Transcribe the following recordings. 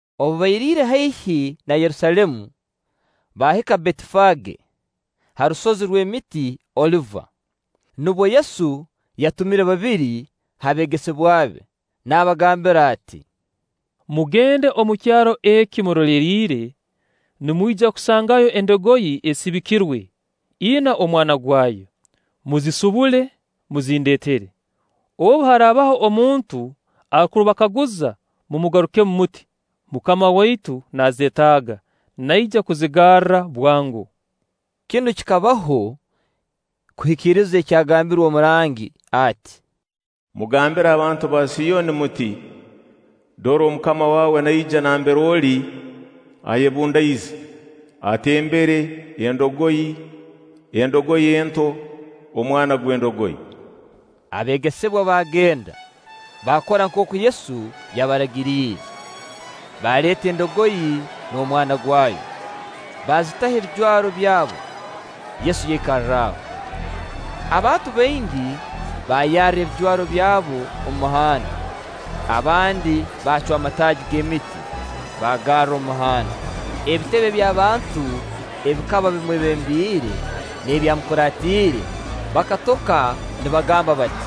Obu bairiire haihi na Yerusaalemu, baahika Betifage, ha rusozi rw'emiti Oliva. Nubwo Yesu yatumire babiri ha beegesebwa be, naabagambira ati: “Mugende omu kyaro eki muroleriire, nimwija kusangayo endogoyi esibikirwe, ina omwana gwayo; muzisibule, muzindeetere. Obu haraabaho omuntu arukubakaguza, mumugarukemu muti: ‘Mukama waitu naazeetaaga’; naija kuzigarra bwango.” Kinu kikabaho kuhikiriza ekyagambirwe omurangi ati: “Mugambire abantu ba Siyoni muti: Dora, omukama waawe naija nambere oli, ayebundaize, atembere endogoyi, endogoyi ento, omwana gw'endogoyi.” Abeegesebwa baagenda, baakora nkooku Yesu yabaragiriire; baaleeta endogoyi n'omwana gwayo, baazitaho ebijwaro byabo, Yesu yaikarraho. Abantu baingi baayarra ebijwaro byabo omu muhanda, abandi baacwa amataagi g'emiti, baagarra omu muhanda. Ebitebe by'abantu ebikaba bimwebembiire n'ebyamukuraatiire baakatoka nibagamba bati: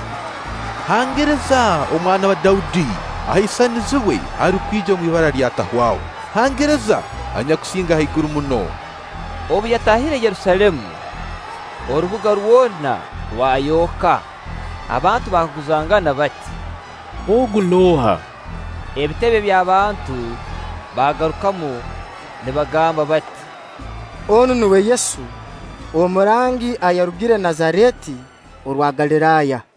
“Hangiriza Omwana wa Daudi! Ahaisanizibwe arukwija omu ibara lya Atahwaho! Hangiriza anyakusinga haiguru muno!” Obu yataahire Yerusaalemu, orubuga rwona rwayooka, abantu baakaguzangana bati: “Ogu nooha?” Ebitebe by'abantu baagarukamu nibagamba bati: “Onu nuwe Yesu, omurangi anyakurugire Nazareeti orwa Galiraaya.”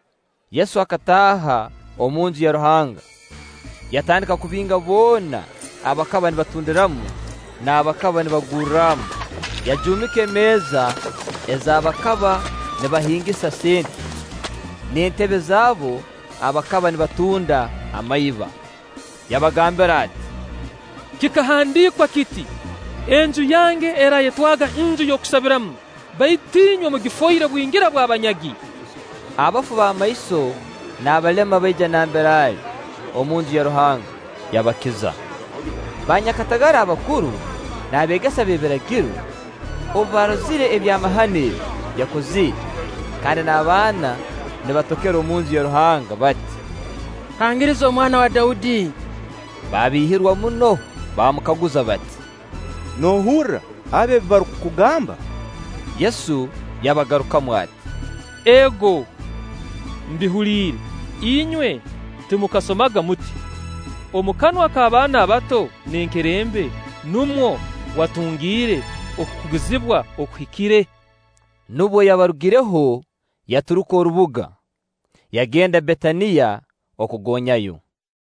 Yesu akataaha omu Nju ya Ruhanga, yatandika kubinga boona abakaba nibatundiramu n'abakaba nibagurramu, yajuumika emeeza ez'abakaba nibahingisa sente, n'entebe z'abo abakaba nibatunda amaiba. Yabagambira ati: “Kikahandiikwa kiti: ‘Enju yange eraayetwaga nju y'okusabiramu’; baitu inywe mugifoire bwingira bw'abanyagi.” Abafu b'amaiso n'abalema baija nambere ali omu Nju ya Ruhanga, yabakiza. Baanyakatagara abakuru n'abeegesa b'ebiragiro obu baarozire ebyamahano ebi yakozire, kandi n'abaana nibatokera omu Nju ya Ruhanga bati: “Hangiriza Omwana wa Daudi!” baabiihirwa muno; baamukaguza bati: “Noohurra abo ebi barukugamba?” Yesu yabagarukamu ati: “Ego, mbihuliire; inywe timukasomaga muti: ‘Omu kanwa k'abaana abato n'enkerembe numwo watungire okukugizibwa okuhikire?’” Nubwo yabarugireho, yaturuka orubuga, yagenda Betaniya kugonyayo.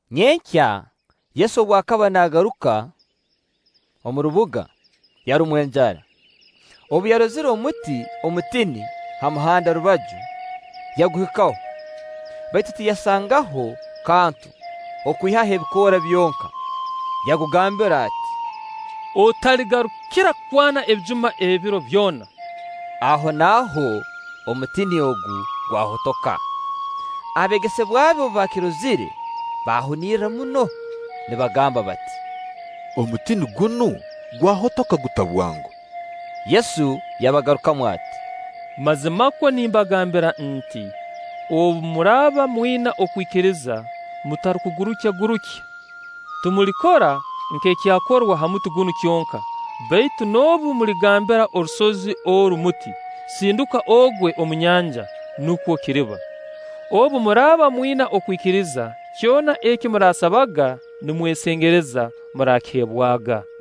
Nyenkya, Yesu obu akaba naagaruka omu rubuga, yarumwa enjara. Obu yarozire omuti omutini ha muhanda rubaju, yaguhikaho, baitu tiyasangaho kantu okwihaho ebikoora byonka. Yagugambira ati: “Otaligarukira kwana ebijuma ebiro byona!” Ahonaaho omutini ogu gwahotoka. Abeegesebwa be obu baakirozire baahunirra muno, nibagamba bati: “Omutini gunu gwahotoka guta bwango?” Yesu yabagarukamu ati: “Mazimakwo nimbagambira nti: Obu muraaba mwina okwikiriza mutarukugurukyagurukya, timulikora nk'ekyakorwa ha muti gunu kyonka, baitu noobu muligambira orusozi oru muti: ‘Sinduka ogwe omu nyanja’, nukwo kiriba. Obu muraaba mwina okwikiriza, kyona eki muraasabaga nimwesengereza, muraakiheebwaga.”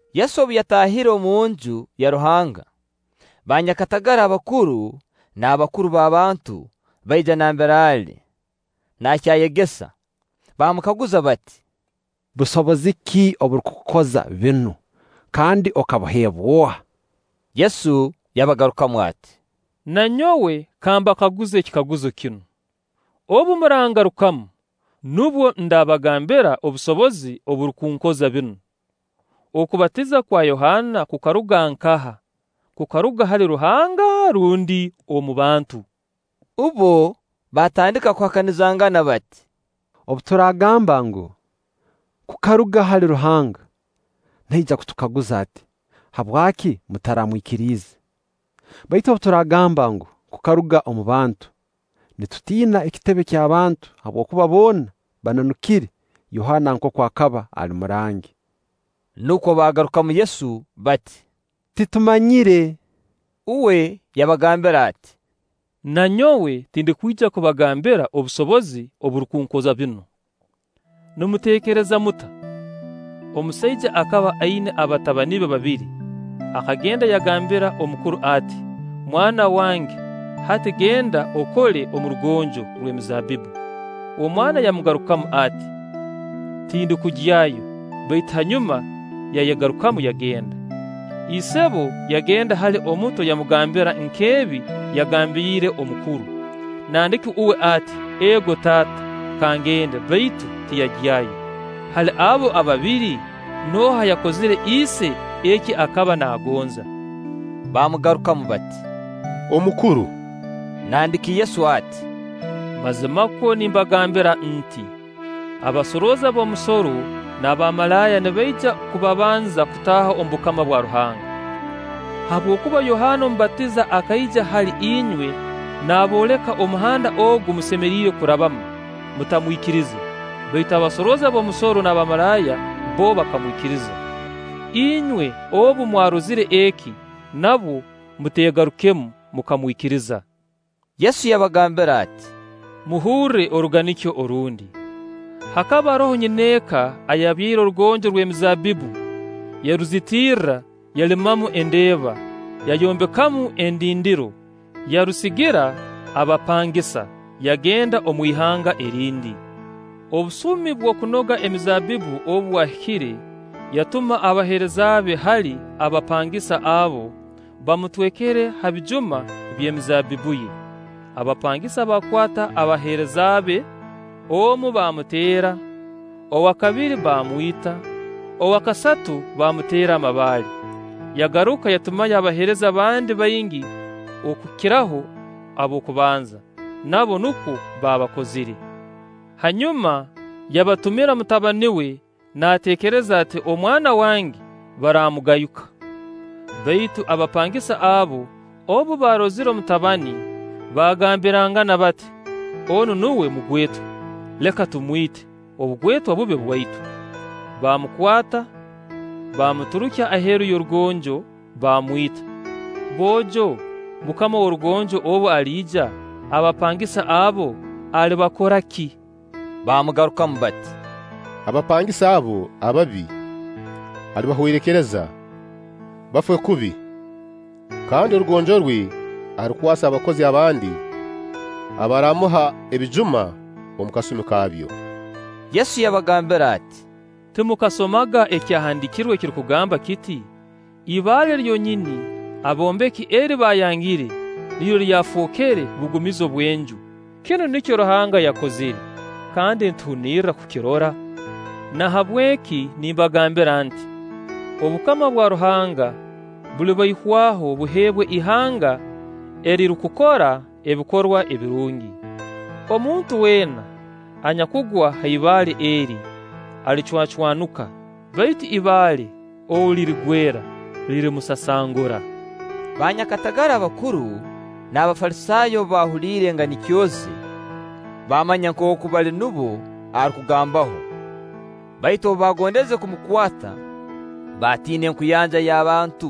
Yesu obu yataahire omunju ya Ruhanga, banyakatagara abakuru n'abakuru b'abantu baija nambere ali nakyayegesa, baamukaguza bati: “Busobozi ki oburukukukoza binu, kandi okabuheebwa oha?” Yesu yabagarukamu ati: “Na nyowe ka mbakaguze ekikaguzo kinu; obu murangarukamu, nubwo ndabagambira obusobozi oburukunkoza binu. Okubatiza kwa Yohaana kukaruga nkaha? Kukaruga hali Ruhanga rundi omu bantu?” Bbo baatandika kuhakanizangana bati: “Obu turaagamba ngu: ‘Kukaruga hali Ruhanga’, naija kutukaguza ati: ‘Habwaki mutaramwikiriize?’ Baitu obu turaagamba ngu: ‘Kukaruga omu bantu’, nitutiina ekitebe ky'abantu, habwokuba boona bananukire Yohaana nkooku akaba ali murangi.” Nukwo baagarukamu Yesu bati: “Titumanyire.” Uwe yabagambira ati: “Na nyowe tindukwija kubagambira obusobozi oburukunkoza binu.” “Nimuteekereza muta? Omusaija akaba aina abatabani be babiri; akagenda yagambira omukuru ati: ‘Mwana wange, hati genda okole omu rugonjo rw'emizaabbibbu.’ Omwana yamugarukamu ati: ‘Tindukugyayo’, baitu hanyuma yayegarukamu, yagenda. Isebo yagenda hali omuto yamugambira nk'ebi yagambiire omukuru. Nandiki uwe ati: ‘Ego taata,’ ka ngende; baitu tiyagyayo. Hali abo ababiri, nooha ayakozire ise eki akaba naagonza?” Baamugarukamu bati: “Omukuru.” Nandiki Yesu ati: “Mazimakwo nimbagambira nti: Abasorooza b'omusoro n'abamalaaya nibaija kubabanza kutaaha omu bukama bwa Ruhanga. Habwokuba Yohaana Omubatiza akaija hali inywe naabooleka omuhanda ogu musemeriire kurabamu, mutamwikirize; baitu abasorooza b'omusoro n'abamalaaya bbo bakamwikiriza. Inywe noobu mwarozire eki, nabwo muteegarukemu mukamwikiriza.” Yesu yabagambira ati: “Muhurre oruganikyo orundi. Hakaba haroho nyineeka ayabyaire orugonjo rw'emizaabbibbu, yaruzitirra, yalimamu endeeba, yayombekamu endindiro, yarusigira abapangisa, yagenda omu ihanga erindi. Obusumi bw'okunoga emizaabbibbu obu bwahikire, yatuma abaheereza be hali abapangisa abo, bamutwekere ha bijuma by'emizaabbibbu ye; abapangisa baakwata abaheereza be, omu baamuteera, owa kabiri baamwita, owa kasatu baamuteera amabaale. Yagaruka yatumayo abaheereza abandi baingi okukiraho ab'okubanza; nabo nukwo baabakozire. Hanyuma yabatumira mutabani we naateekereza ati: ‘Omwana wange baraamugayuka.’ Baitu abapangisa abo obu baarozire omutabani, baagambirangana bati: ‘Onu nuwe mugwetwa, leka tumwite, obugwetwa bube bwaitu.’ Baamukwata, baamuturukya aheeru y'orugonjo, baamwita. Boojo, mukama w'orugonjo obu aliija, abapangisa abo alibakoraki?” Baamugarukamu bati: “Abapangisa abo ababi alibahwerekereza, bafe kubi, kandi orugonjo rwe arukwase abakozi abandi abaraamuha ebijuma omu kasumi kaabyo.” Yesu yabagambira ati: “Timukasomaga Ekyahandiikirwe ekirukugamba kiti: ‘Ibaale lyonyini aboombeki eri baayangire niryo lyafookere bugumizo bw'enju; kinu nikyo Ruhanga yakozire, kandi nituhunirra kukirora’? Nahabweki nimbagambira nti: Obukama bwa Ruhanga bulibaihwaho buheebwe ihanga erirukukora ebikorwa ebirungi. [ Omuntu weena anyakugwa ha ibaale eri, alicwacwanuka; baitu ibaale ou lirigwera, lirimusasangura.]” Baanyakatagara abakuru n'Abafalisaayo obu baahuliire enganikyo ze, baamanya nkooku bali nubo arukugambaho. Baitu obu baagondeze kumukwata, baatiina enkuyanja y'abantu,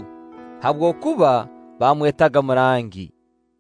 habwokuba baamwetaga murangi.